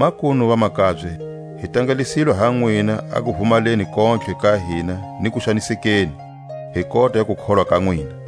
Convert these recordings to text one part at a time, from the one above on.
makunu, vamakabye, hi tangalisilwe ha nwina a kuvumaleni kontlhe ka hina ni kuxanisekeni, hi kota ya kukholwa ka nwina.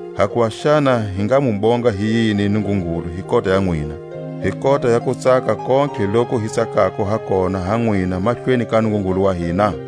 Hakuva xana hi nga mu bonga hi yini Nungungulu hi kota ya nwina, hi kota ya kutsaka kontlhe loku hi tsakako ha kona ha nwina mahlweni ka Nungungulu wa hina?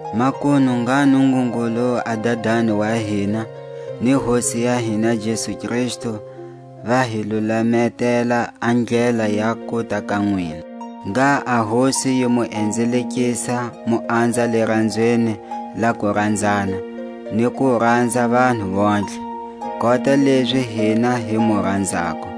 Makunu ngha Nungungulu a Dadani wa hina, ni Hosi ya hina Jesu Kristu, va hi lulametela a ndlela ya kuta ka nwina. Ngha a Hosi yi mu enzelekisa mu anza liranzweni la kuranzana, ni ku ranza vanhu vontlhe, kota lezi hina hi mu ranzako;